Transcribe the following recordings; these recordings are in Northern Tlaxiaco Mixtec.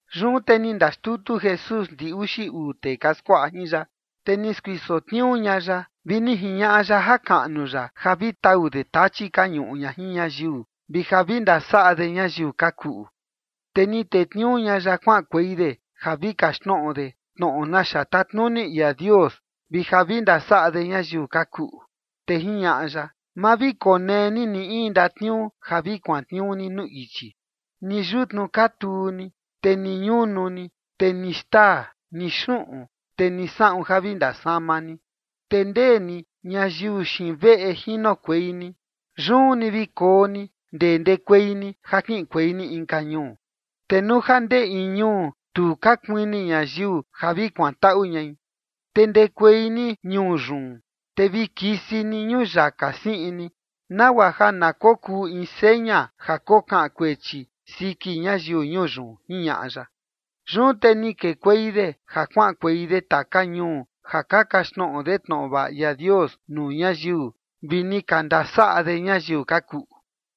Yun te ni ndaxtutu Jesús ndi uxi uu tee ka skuaꞌa jin ya, te ni skuiso tniuu ña ya, vi ni jiñaꞌa ya jakaꞌnu ya ja vi tau de tachi ka ñuꞌu ña jin ñayiu, vi ja vi ndasaꞌa de ñayiu ka kuꞌu. Te ni tetniuu ña ya kuaꞌankuei de ja vi kaxtnoꞌo de tnoꞌo naxa tatnuni ia Dios vi ja vi ndasaꞌa de ñayiu ka kuꞌu. Te jiñaꞌa ya: ―Ma vi konee ni ni in ndatniuu ja vi kuantniuu ni nuu ichi, ni yutnu katuu ni, te ni ñunu ni, te ni xtaa, ni xuꞌun, te ni saꞌun ja vi ndasama ni. Te ndee ni ñayiu xiin veꞌe jinokuei ni, yun ni vi koo ni ndee ndekuei ni ja kiꞌinkuei ni inka ñuu. Te nuu ja ndee in ñuu tu ka kuini ñayiu ja vi kuantaꞌu ñai, te ndekuei ni ñuu yun, te vi kisi ni ñuyaka siꞌin ni, nagua ja na kokuu in seña ja kokaꞌan kuechi siki ñayiu ñuu yun ―jiñaꞌa ya. Yun te ni kekuei de ja kuaꞌankuei de taka ñuu ja ka kaxtnoꞌo de tnoꞌo vaꞌa ia Dios nuu ñayiu, vi ni ka ndasaꞌa de ñayiu ka kuꞌu.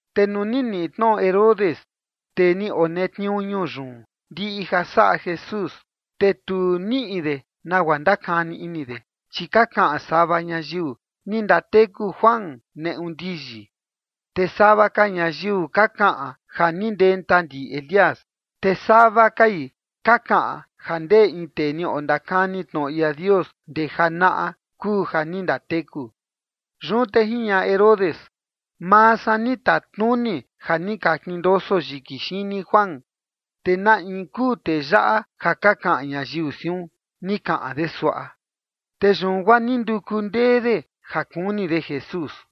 Te nuu ni niꞌi tnoꞌo Herodes, tee ni onetniuu ñuu yun, ndiꞌi ja saꞌa Jesús, te tu niꞌi de nagua ndakani ini de, chi ka kaꞌan sava ñayiu: “Ni ndateku Juan neꞌu ndiyi”. Te sava ka ñayiu ka kaꞌan ja ni ndenta ndi Elías, te sava kai ka kaꞌan ja ndee in tee ni ondakani tnoꞌo ia Dios ndee janaꞌa kuu ja ni ndateku. Yun te jiñaꞌa Herodes: ―Maa san ni tatnuni ja ni ka kindoso yiki xini Juan. ¿Te na in kuu tee yaꞌa ja ka kaꞌan ñayiu siun? ―ni kaꞌan de suaꞌa. Te yun guaa ni nduku ndee de ja kuni de Jesús.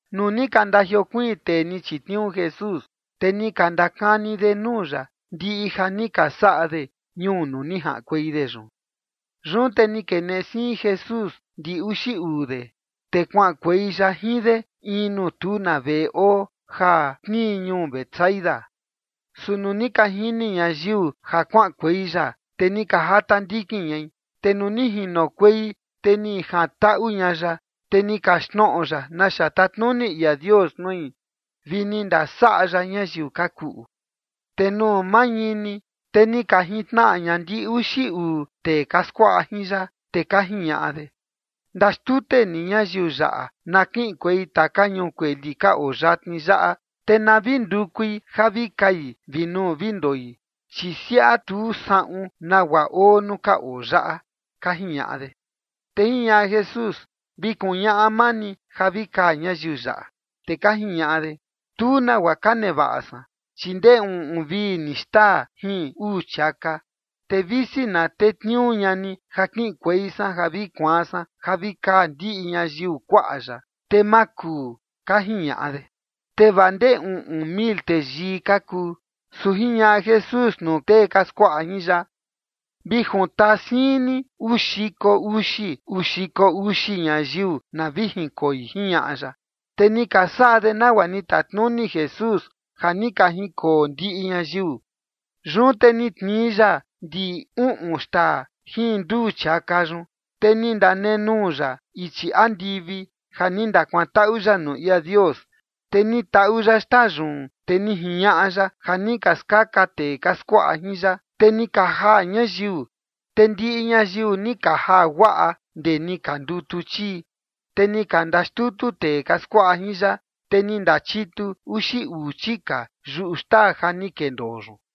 Nuu ni ka ndajiokuiin tee ni chitniuu Jesús, te ni ka ndakani de nuu ya ndiꞌi ja ni ka saꞌa de ñuu nuu ni jaꞌankuei de yun. Yun te ni keneꞌe siin Jesús ndi uxi uu de, te kuaꞌankuei ya jin de in nuu tu na veꞌe oo ja tnii ñuu Betsaida. Su nuu ni ka jini ñayiu ja kuaꞌankuei ya, te ni ka jata ndikin ñai. Te nuu ni jinokuei, te ni jantaꞌu ña ya, te ni kaxtnoꞌo ya naxa tatnuni ia Dios nui vi ni ndasaꞌa ya ñayiu ka kuꞌu. Te nuu mañini, te ni ka jintnaꞌa ña ndi uxi uu tee ka skuaꞌa jin ya, te ka jiñaꞌa de: ―Ndaxtute ni ñayiu yaꞌa na kiꞌinkuei taka ñuu kueli ka oo yatni yaꞌa, te na vi ndukui ja vi kai vi nuu vi ndoi, chi siaꞌa tu saꞌun nagua oo nuu ka oo yaꞌa ―ka jiñaꞌa de. Te jiñaꞌa Jesús: ―Vi kuñaꞌa maa ni ja vi kaa ñayiu yaꞌa. Te ka jiñaꞌa de: ―Tu nagua ka nevaꞌa san, chi ndee uꞌun vi ni xtaa jin uu chiaka, te visi na tetniuu ña ni ja kiꞌinkuei san ja vi kuaan san ja vi kaa ndiꞌi ñayiu kuaꞌa yaꞌa, te ma kuu ―ka jiñaꞌa de. Te vaa ndee uꞌun mil teyii ka kuu. Su jiñaꞌa Jesús nuu tee ka skuaꞌa jin ya: ―Vi juntaa siin ni uu xiko uxi, uu xiko uxi ñayiu na vi jinkoi ―jiñaꞌa ya. Te ni ka saꞌa de nagua ni tatnuni Jesús ja ni ka jinkoo ndiꞌi ñayiu. Yun te ni tnii ya ndi uꞌun xtaa jin nduu chiaka yun, te ni ndanenuu ya ichi andivi ja ni ndakuantaꞌu ya nuu ia Dios. Te ni taꞌu ya xtaa yun, te ni jiñaꞌa ya ja ni ka skaka tee ka skuaꞌa jin ya, te ni ka jaa ñayiu. Te ndiꞌi ñayiu ni ka jaa guaꞌa ndee ni ka ndutu chii, te ni ka ndaxtutu tee ka skuaꞌa jin ya, te ni ndachitu uxi uu chika yuꞌu xtaa ja ni kendoo yun.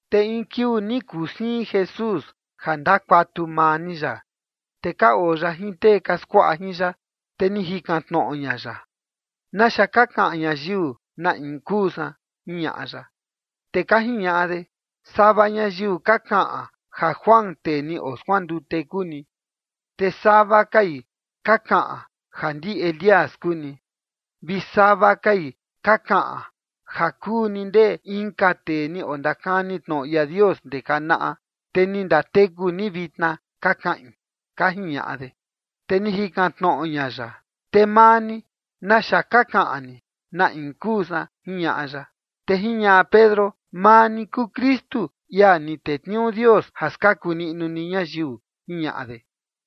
Te in kiuu ni kuu siin Jesús ja ndakuatu maa ni ya, te ka oo ya jin tee ka skuaꞌa jin ya, te ni jikan tnoꞌo ña ya: ―¿Naxa ka kaꞌan ñayiu na in kuu san? ―jiñaꞌa ya. Te ka jiñaꞌa de: ―Sava ñayiu ka kaꞌan ja Juan, tee ni oskuandute, kuu ni. Te sava kai ka kaꞌan ja ndi Elías kuu ni, vi sava kai ka kaꞌan ja kuu ni ndee inka tee ni ondakani tnoꞌo ia Dios ndee janaꞌa, te ni ndateku ni vitna, ka kaꞌin ―ka jiñaꞌa de. Te ni jikan tnoꞌo ña ya: ―Te maa ni, ¿naxa ka kaꞌan ni, na in kuu san? ―jiñaꞌa ya. Te jiñaꞌa Pedro: ―Maa ni kuu Kristu, ia ni tetniuu Dios ja skaku niꞌnu ni ñayiu ―jiñaꞌa de.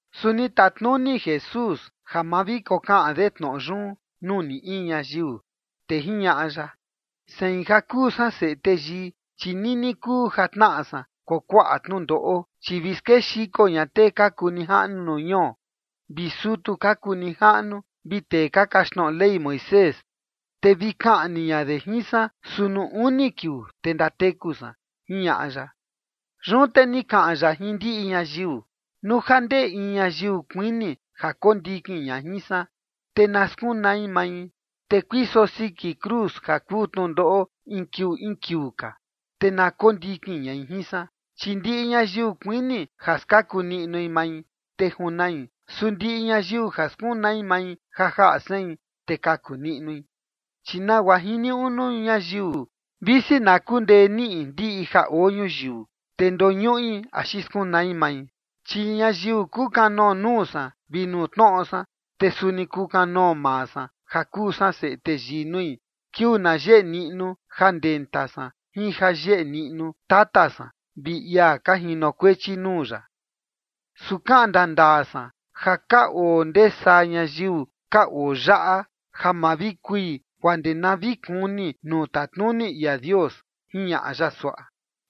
Su ni tatnuni Jesús ja ma vi kokaꞌan de tnoꞌo yun nuu ni in ñayiu. Te jiñaꞌa ya: ―Sein, ja kuu san Seꞌe Teyii, chi nini kuu ja tnaꞌa san kuakuaꞌa tnundoꞌo, chi vi skexiko ña tee ka kuu nijaꞌnu nuu ñuo, vi sutu ka kuu nijaꞌnu, vi tee ka kaxtnoꞌo Ley Moisés, te vi kaꞌni ña de jin san, su nuu uni kiuu, te ndateku san ―jiñaꞌa ya. Yun te ni kaꞌan ya jin ndiꞌi ñayiu: ―Nuu ja ndee in ñayiu kuini ja kondikin ña jin san, te na skunai mai, te kuiso siki cruz ja kuu tnundoꞌo in kiuu in kiuu ka, te na kondikin ñai jin san. Chi ndiꞌi ñayiu kuini ja skaku niꞌnu mai, te junai. Su ndiꞌi ñayiu ja skunai mai ja jaꞌa sein, te kaku niꞌnui. ¿Chi nagua jiniuꞌu nuu ñayiu visi na kundee niꞌi ndiꞌi ja oo ñuyiu, te ndoñuꞌi axi skunai mai? Chi ñayiu kukanoo nuu san vi nuu tnoꞌo san, te suni kukanoo maa san ja kuu san Seꞌe Teyii nui, kiuu na yeꞌe niꞌnu ja ndenta san jin ja yeꞌe niꞌnu Tata san vi ia ka jinokuechi nuu ya. Su kaꞌan ndandaa san ja ka oo ndee saa ñayiu ka oo yaꞌa ja ma vi kui guaa ndee na vi kuni nuu tatnuni ia Dios ―jiñaꞌa ya suaꞌa.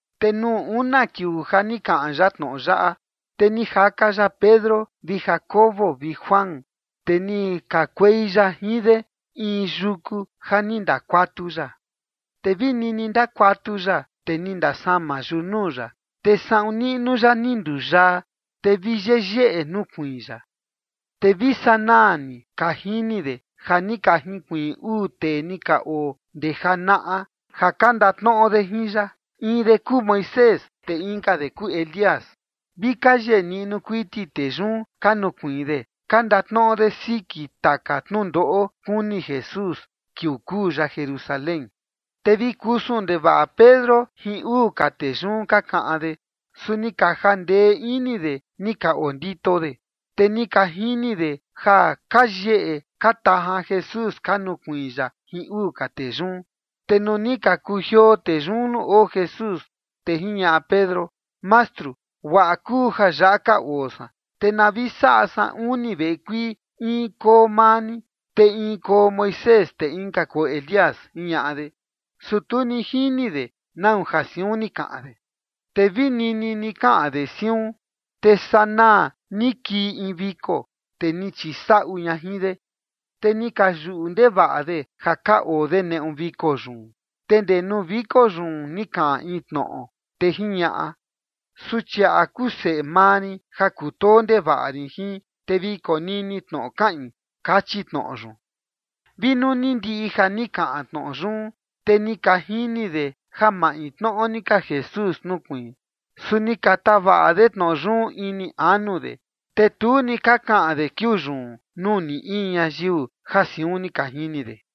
Te nuu una kiuu ja ni kaꞌan ya tnoꞌo yaꞌa, te ni jaka ya Pedro vi Jacobo vi Juan, te ni kakuei ya jin de in yuku ja ni ndakuatu ya. Te vi nini ndakuatu ya, te ni ndasama yunuu ya, te saꞌun niꞌnu ya ni nduyaa, te vi yeyeꞌe nukuiin ya. Te vi sanaa ni ka jini de ja ni ka jinkuiin uu tee ni ka oo ndee janaꞌa ja ka ndatnoꞌo de jin ya. In de kuu Moisés te inka de kuu Elías. Vi ka yeꞌe niꞌnu kuiti tee yun ka nukuiin de, ka ndatnoꞌo de siki taka tnundoꞌo kuni Jesús kiuu kuu ya Jerusalén. Te vi kusun ndevaꞌa Pedro jin uu ka tee yun ka kaꞌan de, su ni ka jandee ini de ni ka ondito de, te ni ka jini de ja ka yeꞌe ka tajan Jesús ka nukuiin ya jin uu ka tee yun. Te nuu ni ka kujioo tee yun nuu oo Jesús, te jiñaꞌa Pedro: ―Mastru, guaꞌa kuu ja yaꞌa ka oo san. Te na vi saꞌa san uni veꞌe kuii, in koo maa ni, te in koo Moisés te inka koo Elías ―jiñaꞌa de. Su tu ni jini de nau ja siun ni kaꞌan de. Te vi nini ni kaꞌan de siun, te sanaa ni kii in viko, te ni chisaꞌu ña jin de, te ni ka yuꞌu ndevaꞌa de ja ka oo de neꞌu viko yun. Te ndee nuu viko yun ni kaꞌan in tnoꞌo, te jiñaꞌa: ―Suchiaꞌa kuu seꞌe maa rin ja kutoo ndevaꞌa rin jin, te vi konini tnoꞌo kaꞌin ―kachi tnoꞌo yun. Vi nuu ni ndiꞌi ja ni kaꞌan tnoꞌo yun, te ni ka jini de ja maintnoꞌo ni ka Jesús nukuiin. Su ni ka tavaꞌa de tnoꞌo yun ini anu de. Te tu ni ka kaꞌan de kiuu yun nuu ni in ñayiu ja siun ni ka jini de.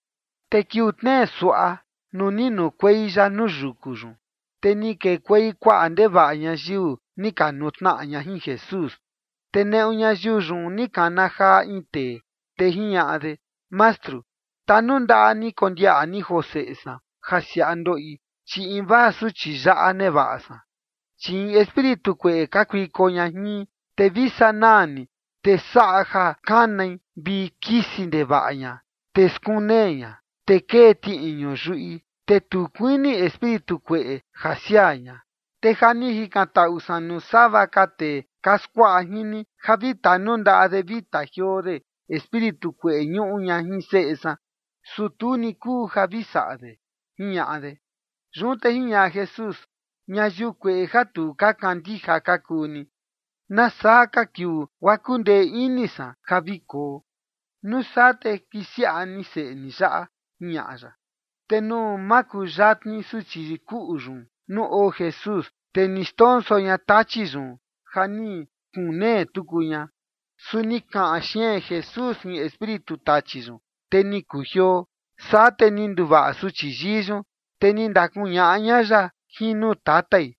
Te kiuu tnee suaꞌa, nuu ni nukuei ya nuu yuku yun, te ni kekuei kuaꞌa ndevaꞌa ñayiu, ni ka nutnaꞌa ña jin Jesús. Te neꞌu ñayiu yun ni kana jaa in tee, te jiñaꞌa de: ―Mastru, tanundaꞌa ni kondiaꞌa ni joo seꞌe san ja siaꞌa ndoꞌi, chi invaa suchi yaꞌa nevaꞌa san. Chi in espíritu kueꞌe kakuiko ña jin, te vi sanaa ni te saꞌa ja kanai, vi kisi ndevaꞌa ña, te skunee ña, te kee tiꞌiñu yuꞌi, te tu kuini espíritu kueꞌe ja siaa ña. Te ja ni jikantaꞌu san nuu sava ka tee ka skuaꞌa jin ni ja vi tanundaꞌa de vi tajioo de espíritu kueꞌe ñuꞌu ña jin seꞌe san, su tu ni kuu ja vi saꞌa de ―jiñaꞌa de. Yun te jiñaꞌa Jesús: ―Ñayiu kueꞌe ja tu ka kandija ka kuu ni. ¿Nasaa ka kiuu guaa kundee ini san ja vi koo? Nuu saa te kisiaꞌa ni seꞌe ni yaꞌa ―jiñaꞌa ya. Te nuu makuyatni suchi kuꞌu yun nuu oo Jesús, te ni xndonso ña tachi yun ja ni skunee tuku ña. Su ni kaꞌan xeen Jesús jin espíritu tachi yun, te ni kujioo. Saa te ni nduvaꞌa suchi yii yun, te ni ndakuñaꞌa ña ya jin nuu tatai.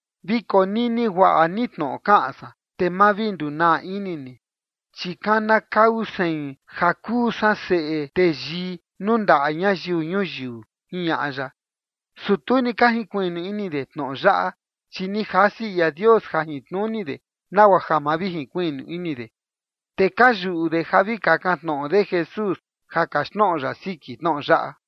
―Vi konini guaꞌa ni tnoꞌo kaꞌan san, te ma vi ndunaa ini ni, chi kanakau sein ja kuu san Seꞌe Teyii nuu ndaꞌa ñayiu ñuyiu ―jiñaꞌa ya. Su tu ni ka jinkuiꞌnu ini de tnoꞌo yaꞌa, chi ni jasi ia Dios jajintnuni de nagua ja ma vi jinkuiꞌnu ini de. Te ka yuꞌu de ja vi kakan tnoꞌo de Jesús ja kaxtnoꞌo ya siki tnoꞌo yaꞌa.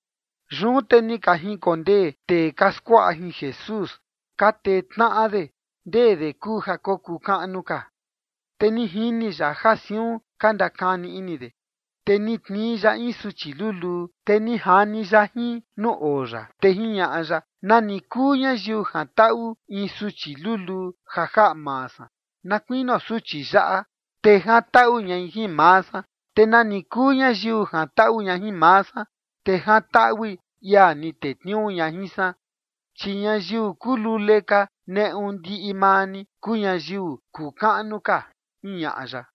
Yun te ni ka jinkondee tee ka skuaꞌa jin Jesús ka tee tnaꞌa de ndee de kuu ja kokuu kaꞌnu ka. Te ni jini ya ja siun ka ndakani ini de, te ni tnii ya in suchi luluu, te ni jani ya jin nuu oo ya. Te jiñaꞌa ya: ―Nani kuu ñayiu jantaꞌu in suchi luluu ja jaꞌa maa san na kuinio suchi yaꞌa, te jantaꞌu ñai jin maa san. Te nani kuu ñayiu jantaꞌu ña jin maa san, te jantaꞌui ia ni tetniuu ña jin san. Chi ñayiu kuu lule ka neꞌu ndiꞌi maa ni, kuu ñayiu kuu kaꞌnu ka ―jiñaꞌa ya.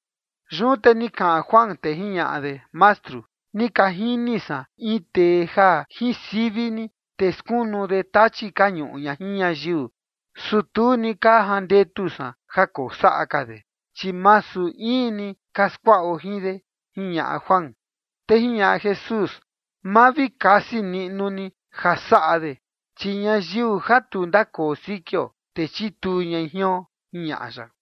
Yun te ni kaꞌan Juan, te jiñaꞌa de: ―Mastru, ni ka jini san in tee ja jin sivi ni, te skunu de tachi ka ñuꞌu ña jin ñayiu. Su tu ni ka jandetu san ja kosaꞌa ka de, chi masu in ni ka skuaꞌo jin de ―jiñaꞌa Juan. Te jiñaꞌa Jesús: ―Ma vi kasi niꞌnu ni ja saꞌa de, chi ñayiu ja tu ndakoo sikio, te chituu ñai jion ―jiñaꞌa ya.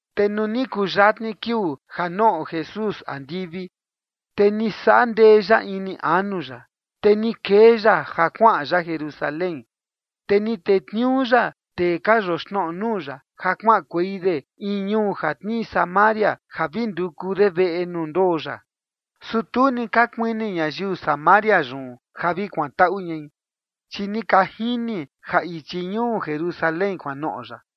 Te nuu ni kuyatni kiuu ja noꞌo Jesús andivi, te ni saꞌa ndee ya ini anu ya, te ni kee ya ja kuaꞌan ya Jerusalén. Te ni tetniuu ya tee ka yoxnoꞌo nuu ya ja kuaꞌankuei de in ñuu ja tnii Samaria ja vi nduku de veꞌe nuu ndoo ya. Su tu ni ka kuini ñayiu Samaria yun ja vi kuantaꞌu ñai, chi ni ka jini ja ichi ñuu Jerusalén kuanoꞌo ya.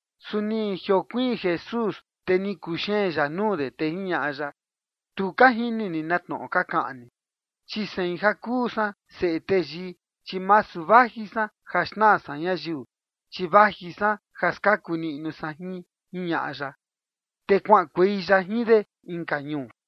Su ni jiokuiin Jesús, te ni kuxeen ya nuu de, te jiñaꞌa ya: ―Tu ka jini ni na tnoꞌo ka kaꞌan ni. Chi sein ja kuu san Seꞌe Teyii, chi masu vaji san ja xnaa san ñayiu, chi vaji san ja skaku niꞌnu san jin ―jiñaꞌa ya. Te kuaꞌankuei ya jin de inka ñuu.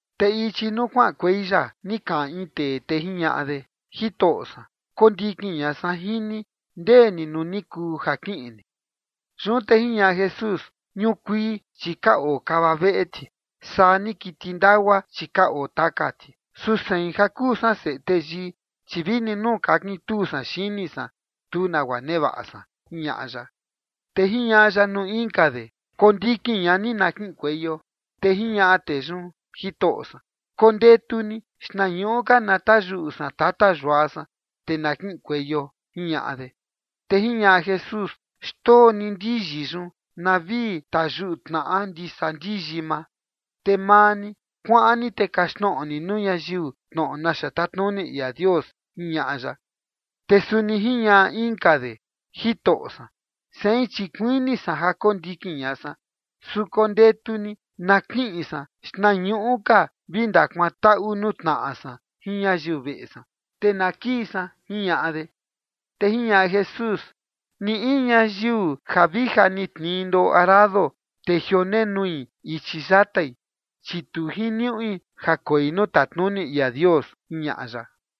Te ichi nuu kuaꞌankuei ya, ni kaꞌan in tee, te jiñaꞌa de: ―Jitoꞌo san, kondikin ña san jin ni ndee ni nuu ni kuu ja kiꞌin ni. Yun te jiñaꞌa Jesús: ―Ñukuii, chi ka oo kava veꞌe ti, saa ni kiti ndagua, chi ka oo taka ti. Su sein ja kuu san Seꞌe Teyii, chi vini nuu kakintuu san xini san, tu nagua nevaꞌa san ―jiñaꞌa ya. Te jiñaꞌa ya nuu inka de: ―Kondikin ña ni na kiꞌinkueio. Te jiñaꞌa tee yun: ―Jitoꞌo san, kondetu ni xtnañuꞌu ka na tayuꞌu san tata yua san, te na kiꞌinkueio ―jiñaꞌa de. Te jiñaꞌa Jesús: ―Xndoo ni ndiyi yun na vi tayuꞌu tnaꞌa ndisa ndiyi maa. Te maa ni, kuaꞌan ni te kaxtnoꞌo ni nuu ñayiu tnoꞌo naxa tatnuni ia Dios ―jiñaꞌa ya. Te suni jiñaꞌa inka de: ―Jitoꞌo san, sein chi kuini san ja kondikin ña san, su kondetu ni na kiꞌin san xtnañuꞌu ka vi ndakuantaꞌu nuu tnaꞌa san jin ñayiu veꞌe san, te na kii san ―jiñaꞌa de. Te jiñaꞌa Jesús: ―Ni in ñayiu ja vi ja ni tnii ndoꞌo arado, te jionenui ichi yatai, chi tu jiniuꞌi ja koi nuu tatnuni ia Dios ―jiñaꞌa ya.